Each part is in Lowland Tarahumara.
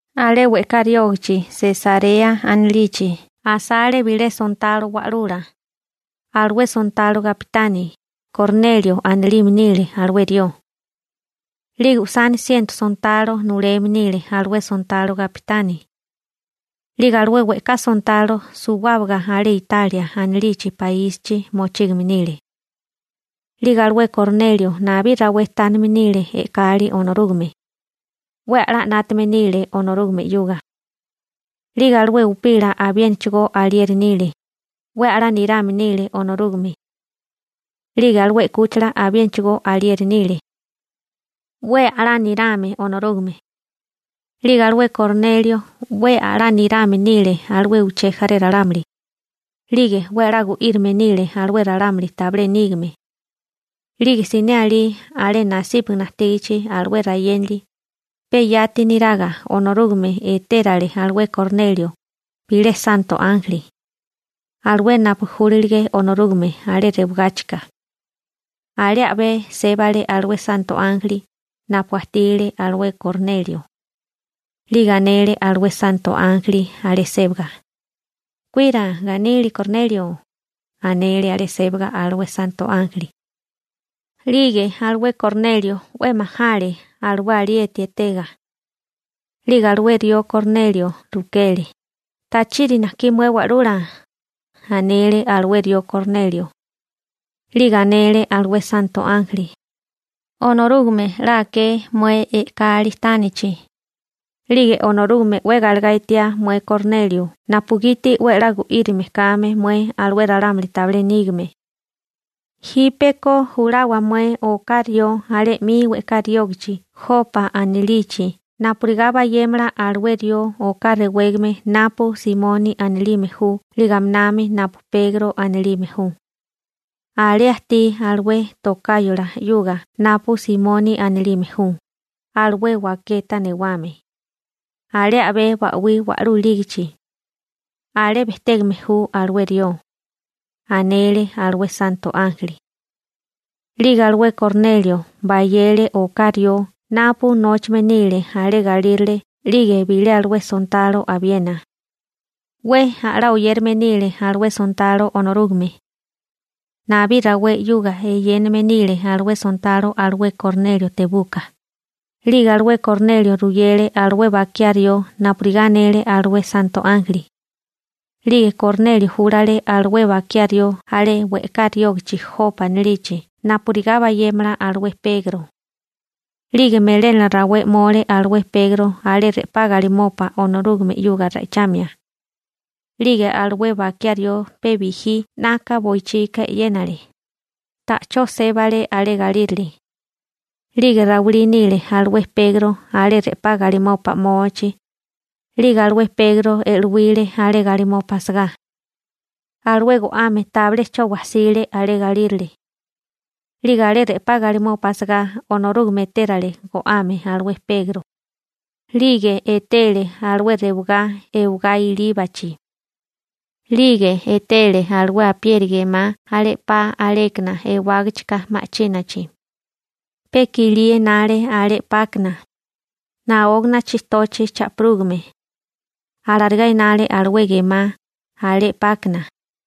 Alé we'ká riógachi Sesarea anilichi asale bilé sontalo wa'lula, alué sontalo gapitani. Kornelio anilime nile alué rió. 'Lige usani siento sontalo nuleme nile alué sontalo gapitani. 'Lige alué we'ká sontalo suwábaga alé Italia anilichi paísichi mochígame nile. 'Lige alué Kornelio nabí rawé tánime nile e'kali Onorúgame, 'we a'lá 'nátame nile Onorúgame 'yuga. 'Lige alué upila abiénachigó alieri nile, 'we a'lá nirame nile Onorúgame. 'Lige alué 'kúchila abiénachigó alieri nile, 'we a'lá nirame Onorúgame. 'Lige alué Kornelio 'we a'lá nirame nile alué uché jaré ralámuli, 'lige 'we a'lá gu'írime nile alué ralámuli tabilé nígame. 'Lige siné alí alé nasípagana ajtígachi alué rayénali, pe yati niraga Onorúgame etérale alué Kornelio bilé santo ánjeli, alué napu júlilige Onorúgame alé rewagáchika. Alé a'bé sébale alué santo ánjeli napu ajtile alué Kornelio. 'Lige anele alué santo ánjeli alé sébaga: ―¡Kuira ganili Kornelio! ―anele alé sébaga alué santo ánjeli. 'Lige alué Kornelio 'we majale alué alieti etega. 'Lige alué rió Kornelio rukele: ―¿Tachiri najkí mué Wa'lula? ―anele alué rió Kornelio. 'Lige anele alué santo ánjeli: ―Onorúgame 'la aké mué e'kali tánichi. 'Lige Onorúgame 'we galegá etiá mué Kornelio napugiti 'we a'lá gu'írime kame mué alué ralámuli tabilé nígame. Jípeko julawa mué oká rió alé 'mi we'ká riógachi Jopa anilichi napurigá bayémala alué rió oká rewégame napu Simoni anilime ju 'lige aminami napu Pegro anilime ju. Alé ajtí alué tokáyola 'yuga napu Simoni anilime ju, alué waketa newame, alé a'bé ba'wí wa'lú ilígichi, alé bejtégame ju alué rió ―anele alué santo ánjeli. 'Lige alué Kornelio bayele oká rió napu nóchame nile alé galírale 'lige bilé alué sontalo abiena. 'We a'lá oyérame nile alué sontalo Onorúgame. Nabí rawé 'yuga eyéname nile alué sontalo alué Kornelio tebuka. 'Lige alué Kornelio ruyele alué bakiá rió napurigá anele alué santo ánjeli. 'Lige Kornelio júlale alué bakiá rió alé we'ká riógichi Jopa anilichi napurigá bayémala alué Pegro. 'Lige melénala rawé 'mole alué Pegro alé re'pá galimopa Onorúgame 'yuga ra'ichamia. 'Lige alué bakiá rió pe bijí 'naka boichika e'yénale, ta'chó sébale alé galírale. 'Lige rawilí nile alué Pegro alé re'pá galimopa 'mochi. 'Lige alué Pegro e'luíle alé galimopa asagá. Alué go'ame tabilé 'cho wajsile alé galírale. 'Lige alé re'pá galimopa asagá Onorúgame etérale go'ame alué Pegro. 'Lige etele alué rewagá ewagá ilíbachi. 'Lige etele alué apieri gemá alé 'pa alékana ewágachika ma'chínachi. Pe kilí enale alé 'pákana, naógana chijtochi cha'pirúgame, alarigá enale alué gemá alé 'pákana.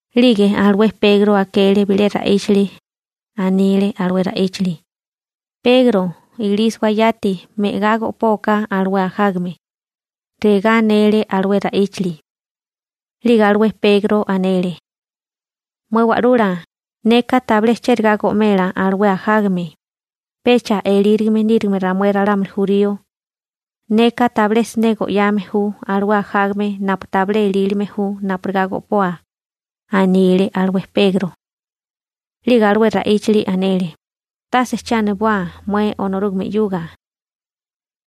'Lige alué Pegro akele bilé ra'íchili. Anile alué ra'íchili: ―Pegro, ilísiwa, yati me'gá go'póaká alué ajágame ―regá anele alué ra'íchili. 'Lige alué Pegro anele: ―Mué Wa'lula, neka tabilé chérigá go'mela alué ajágame, pecha elírigime níriga ramué ralámuli jurío. Neka tabilé siné go'yame ju alué ajágame napu tabilé elílime ju napurigá go'poa ―anile alué Pegro. 'Lige alué ra'íchili anele: ―Tase che aniboa mué Onorúgame 'yuga.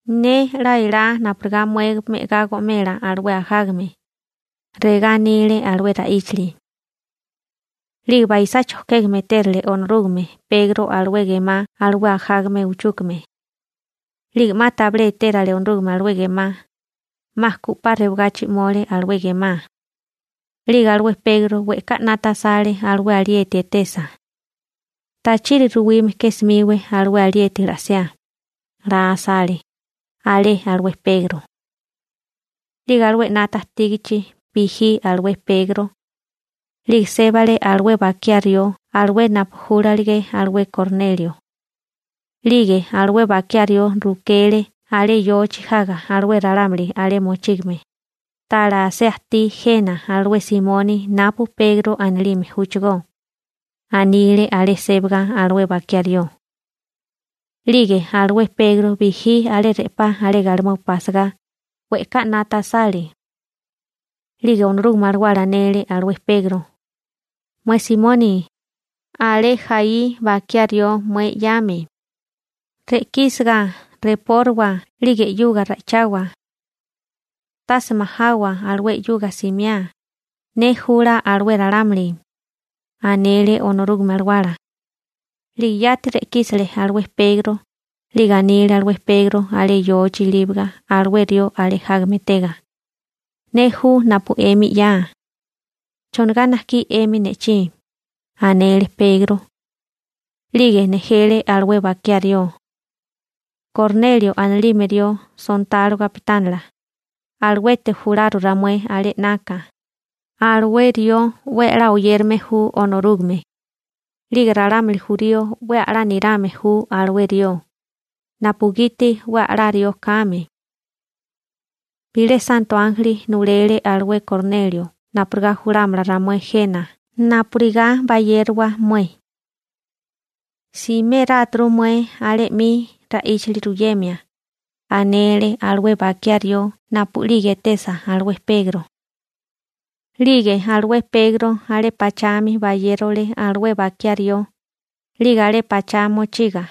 Ne 'la elá napurigá mué me'agá go'mela alué ajágame ―regá anile alué ra'íchili. 'Lige baisá chojkégame etérale Onorúgame Pegro alué gemá alué ajágame uchúkame. 'Lige 'ma tabilé etérale Onorúgame alué gemá, 'ma ku 'pa rewagachi 'mole alué gemá. 'Lige alué Pegro we'ká 'nata asale alué alieti etesa. «Tachiri ruwime ke 'smíwé alué alieti la'siá», la asale alé alué Pegro. 'Lige alué 'nata ajtígichi bijí alué Pegro, 'lige sébale alué bakiá rió alué napu júlalige alué Kornelio. 'Lige alué bakiá rió rukele alé yochi jaga alué ralámuli alé mochígame: ―¿Tala asé ajtí jena alué Simoni napu Pegro anilime júchigó? ―anile alé sébaga alué bakiá rió. 'Lige alué Pegro bijí alé re'pá alé galimopa asagá, we'ká 'nata asale. 'Lige Onorúgame Alawala anele alué Pegro: ―Mué Simoni, alé jaí bakiá rió mué 'yame. Re'kísiga repórawa 'lige 'yuga ra'ichawa. Tase majawa alué 'yuga simiá. Ne jula alué ralámuli ―anele Onorúgame Alawala. 'Lige yati re'kísele alué Pegro. 'Lige anile alué Pegro alé yochi ilíbaga alué rió alé jágame etega: ―Ne ju napu 'emi 'ya. ¿Chonigá 'yamí 'emi ne'chí? ―anele Pegro. 'Lige nejele alué bakiá rió: ―Kornelio anilime rió sontalo gapitánila, aluete jularu ramué alé 'naka. Alué rió 'we a'lá oyérame ju Onorúgame. 'Lige ralámuli jurío 'we a'lá nirame ju alué rió, napugiti 'we a'lá rió kame. Bilé santo ánjeli nulele alué Kornelio napurigá julámala ramué jena napurigá bayérowa mué. Simérátu mué alé 'mi ra'íchili ruyemia ―anele alué bakiá rió napu'lige etesa alué Pegro. 'Lige alué Pegro alé pachami bayérole alué bakiá rió. 'Lige alé pachá mochiga,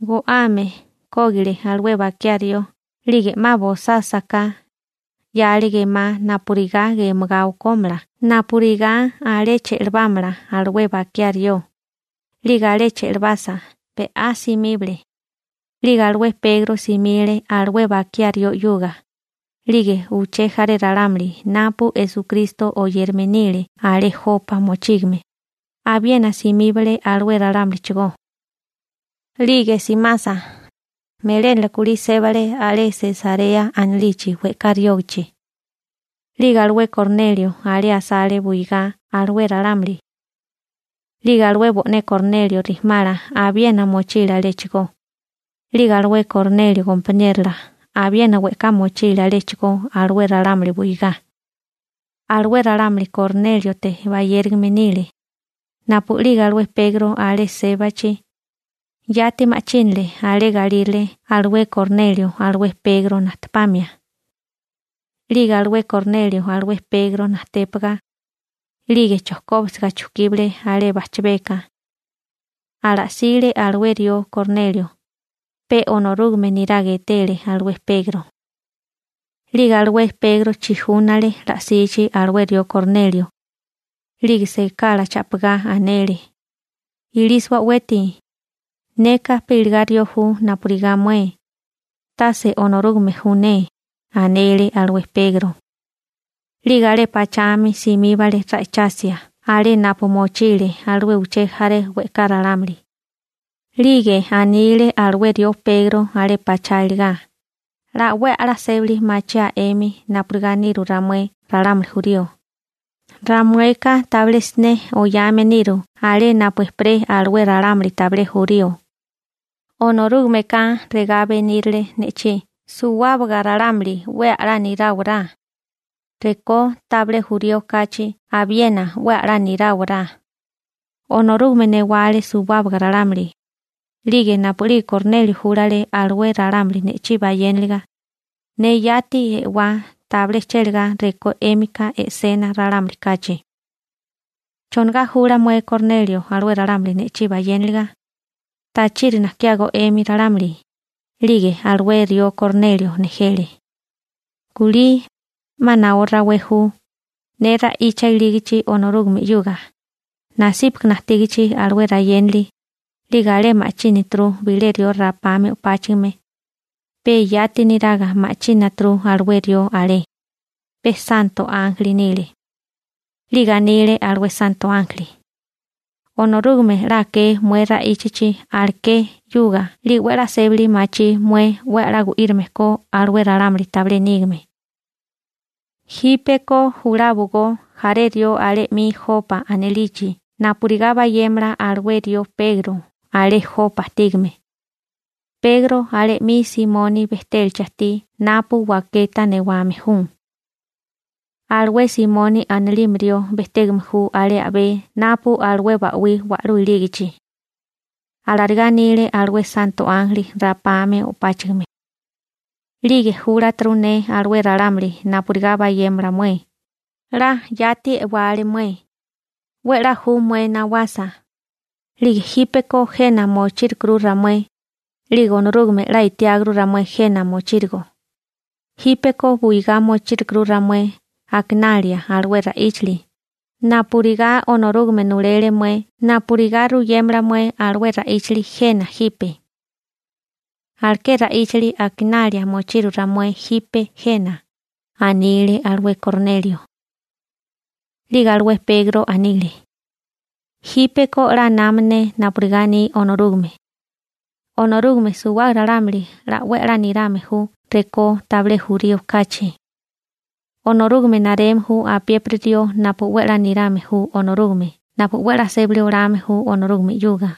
go'ame kógile alué bakiá rió. 'Lige 'ma bosásaká, 'yale gemá napurigá gemagá okómala napurigá alé che'labámala alué bakiá rió. 'Lige alé che'labasa, be'á simíbale. 'Lige alué Pegro simile alué bakiá rió 'yuga, 'lige uché jaré ralámuli napu Esukristo oyérame nile alé Jopa mochígame, abiena simíbale alué ralámulichigó. 'Lige simasa, melénala kulí sébale alé Sesarea anilichi we'ká riógichi. 'Lige alué Kornelio alé asale buigá alué ralámuli. 'Lige alué bo'né Kornelio rijimala abiena mochile aléchigó. 'Lige alué Kornelio gompaniérola abiena we'ká mochile aléchigó alué ralámuli buigá. Alué ralámuli Kornéliote bayérigame nile. Napu'lige alué Pegro alé sébachi, yati ma'chínale alé galírale alué Kornelio alué Pegro najtepamia. 'Lige alué Kornelio alué Pegro najtépaga, 'lige chojkóbisiga chukíbale alé bajchabeka. Ala'sile alué rió Kornelio, pe Onorúgame neraga etele alué Pegro. 'Lige alué Pegro chijúnale la'sichi alué rió Kornelio. 'Lige sekala cha'pigá anele: ―Ilísiwa o'weti. Neka pe iligá rió ju napurigá mué, tase Onorúgame ju ne ―anele alué Pegro. 'Lige alé pachami simíbale ra'ichasia alé napu mochile alué uché jaré we'ká ralámuli. 'Lige anile alué rió Pegro alé pachá iligá: ―'La 'we a'lá sébali machiáa 'emi napurigá niru ramué ralámuli jurío. Ramueka tabilé siné oyame niru alé napu ejperé alué ralámuli tabilé jurío. Onorúgameka regá benírile ne'chí suwábaga ralámuli 'we a'lá niráwará, rekó tabilé jurío kachi abiena 'we a'lá niráwará. Onorúgame newale suwábaga ralámuli. 'Lige napu'lige Kornelio júlale alué ralámuli ne'chí bayéniliga, ne yati e'wá tabilé chélagá rekó 'émika e'sena ralámuli kachi. ¿Chonigá jula mué Kornelio alué ralámuli ne'chí bayéniliga? ¿Tachiri nakiágó 'emi ralámuli? 'Lige alué rió Kornelio nejele. ―Kulí, 'ma naó rawé ju, ne ra'icha ilígichi Onorúgame 'yuga, nasípagana ajtígichi alué rayénali, 'lige alé ma'chínaturu bilé rió rapame o'páchigime, pe yati niraga ma'chínaturu alué rió alé. Pe santo ánjeli nile. 'Lige anile alué santo ánjeli: «Onorúgame 'la aké mué ra'íchachi aleké 'yuga 'lige 'we 'la sébali machí mué 'we a'lá gu'írime ko alué ralámuli tabilé nígame. Jípeko juláwagó jaré rió alé 'mi Jopa anilichi napurigá bayémala alué rió Pegro alé Jopa ajtígame. Pegro alé 'mi Simoni bejtélachi ajtí napu waketa newame ju. Alué Simoni anilime rió bejtégame ju alé a'bé napu alué ba'wí wa'lú ilígichi.» Alarigá anile alué santo ánjeli rapame o'páchigime. 'Lige júlaturu ne alué ralámuli napurigá bayémala mué. 'La yati e'wale mué. 'We 'la ju mué nawasa. 'Lige jípeko jena mochírukuru ramué, 'lige Onorúgame 'la etiáguru ramué jena mochírigo. Jípeko buigá mochírukuru ramué akinalia alué ra'íchili. Napurigá Onorúgame nulele mué napurigá ruyémala mué alué ra'íchili jena jipe, aleké ra'íchili akinalia mochiru ramué jipe jena ―anile alué Kornelio. 'Lige alué Pegro anile: ―Jípeko 'la nama ne napurigá aní Onorúgame. Onorúgame suwábaga ralámuli 'la 'we a'lá nirame ju rekó tabilé jurío kachi. Onorúgame nareme ju apiépiri rió napu 'we a'lá nirame ju Onorúgame napu 'we a'lá sébali olame ju Onorúgame 'yuga.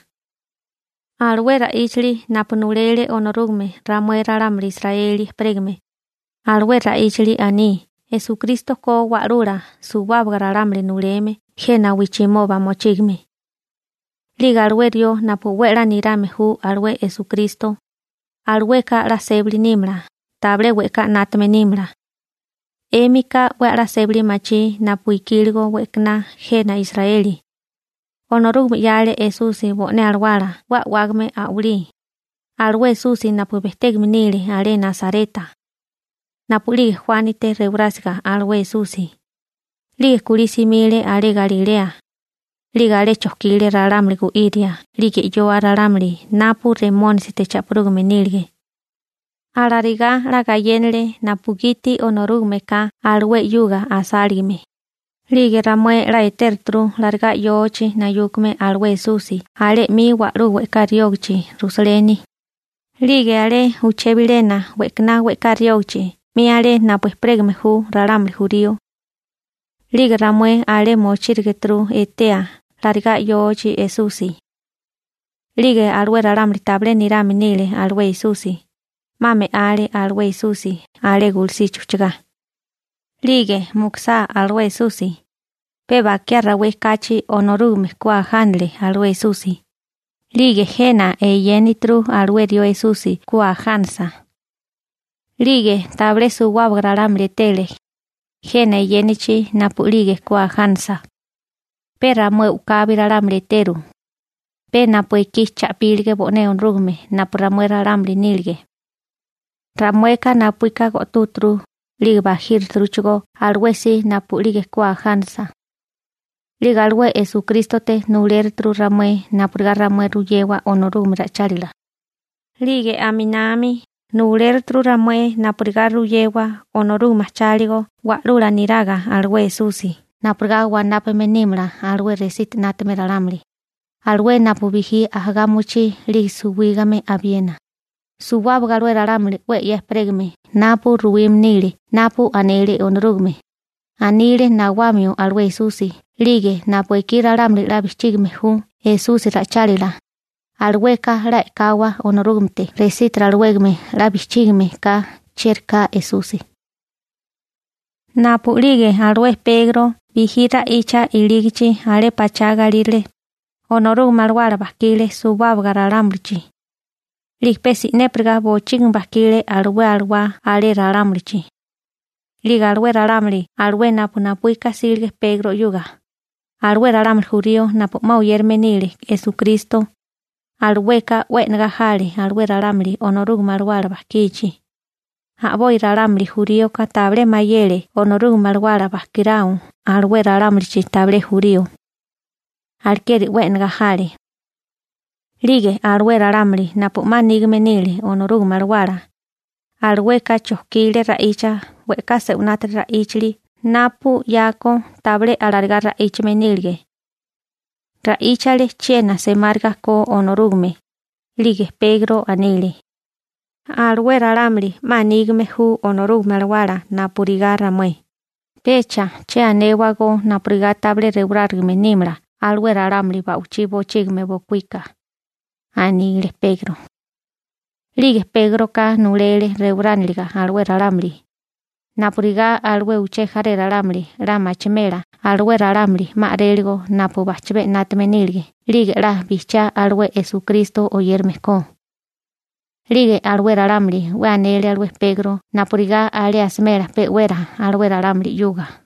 Alué ra'íchili napu nulele Onorúgame ramué ralámuli Israeli ejperégame, alué ra'íchili aní Esukristo ko Wa'lula suwábaga ralámuli nuleme jena wijchimoba mochígame. 'Lige alué rió napu 'we a'lá nirame ju alué Esukristo, alueka 'la sébali nímala, tabilé we'ká 'nátame nímala. 'Émika 'we a'lá sébali machí napu ikíligo we'kaná jena Israeli. Onorúgame 'yale Esusi bo'né alawala 'we a'wágame a'walí, alué Esusi napu bejtégame nile alé Nasareta. Napu'lige Juánite rewarásiga alué Esusi, 'lige kulí simile alé Galilea, 'lige alé chojkile ralámuli gu'íria 'lige 'yoa ralámuli napu Remónisite cha'pirúgame nílige. Alarigá 'la gayénale napugiti Onorúgameka alué 'yuga asáligame. 'Lige ramué 'la etéruturu larigá yochi nayúkame alué Esusi alé 'mi wa'lú we'ká riógachi Rusaleni, 'lige alé uché bilena we'kaná we'ká riógachi 'mi alé napu ejperégame ju ralámuli jurío. 'Lige ramué alé mochírigituru etea larigá yochi Esusi. 'Lige alué ralámuli tabilé nirame nile alué Esusi, 'ma me'ale alué Esusi alé gulusichi ujchagá. 'Lige mukusá alué Esusi, pe bakiá rawé kachi Onorúgame ku ajánale alué Esusi. 'Lige jena eyénituru alué rió Esusi ku ajánasa. 'Lige tabilé suwábaga ralámuli etele jena eyénachi napu'lige ku ajánasa. Pe ramué u'kabi ralámuli eteru, pe napu ekí cha'pílige bo'né Onorúgame napu ramué ralámuli nílige. Ramueka napuíka go'túgeturu 'lige bajíruturuchigó alué si napu'lige ku ajánasa. 'Lige alué Esukrístote nulérituru ramué napurigá ramué ruyewa Onorúgame ra'ichálila. 'Lige aminami nuléruturu napurigá ramué ruyémala Onorúgame ajcháligo wa'lula niraga alué Esusi napurigá wanápame nímala alué resiti 'nátame ralámuli, alué napu bijí ajagá mochí 'lige suwígame abiena. Suwábaga alué ralámuli 'we 'ya ejperégame napu ruwime nile napu anele Onorúgame, anile nawamio alué Esusi 'lige napu ekí ralámuli 'la bijchígime ju Esusi ra'ichálila, alueka 'la e'kawa Onorúgamete resítiri alawégame 'la bijchígame ka chieri ka Esusi. Napu'lige alué Pegro bijí ra'icha ilígichi alé pachá galírale, Onorúgame Alawala bajkile suwábaga ralámulichi. 'Lige pe si'népiriga bochígimi bajkile alué alawá alé ralámulichi. 'Lige alué ralámuli alué napu napuíka jsílige Pegro 'yuga, alué ralámuli jurío napu 'ma oyérame nile Esukristo, alueka 'we e'negá jale alué ralámuli Onorúgame Alawala bajkichi. A'boi ralámuli juríoka tabilé mayele Onorúgame Alawala bajkirao alué ralámulichi tabilé jurío, alekeri 'we e'negá jale. 'Lige alué ralámuli napu 'ma nígame nile Onorúgame Alawala, alueka chojkile ra'icha we'ká se'winátiri ra'íchili napu 'yako tabilé alarigá ra'íchame nílige. Ra'íchale chiena semáriga ko Onorúgame. 'Lige Pegro anile: ―Alué ralámuli 'ma nígame ju Onorúgame Alawala napurigá ramué. Pecha che anéwagó napurigá tabilé rewarárigame nímala alué ralámuli ba'wichí bochígimi bokuíka ―anile Pegro. 'Lige Pégroka nulele rewarániliga alué ralámuli, napurigá alué uché jaré ralámuli 'la machimela alué ralámuli 'ma a'réligo napu bajchabé 'nátame nílige 'lige 'la bijchiá alué Esukristo oyérame ko. 'Lige alué ralámuli 'we anele alué Pegro napurigá alé asimela pe'wera alué ralámuli 'yuga.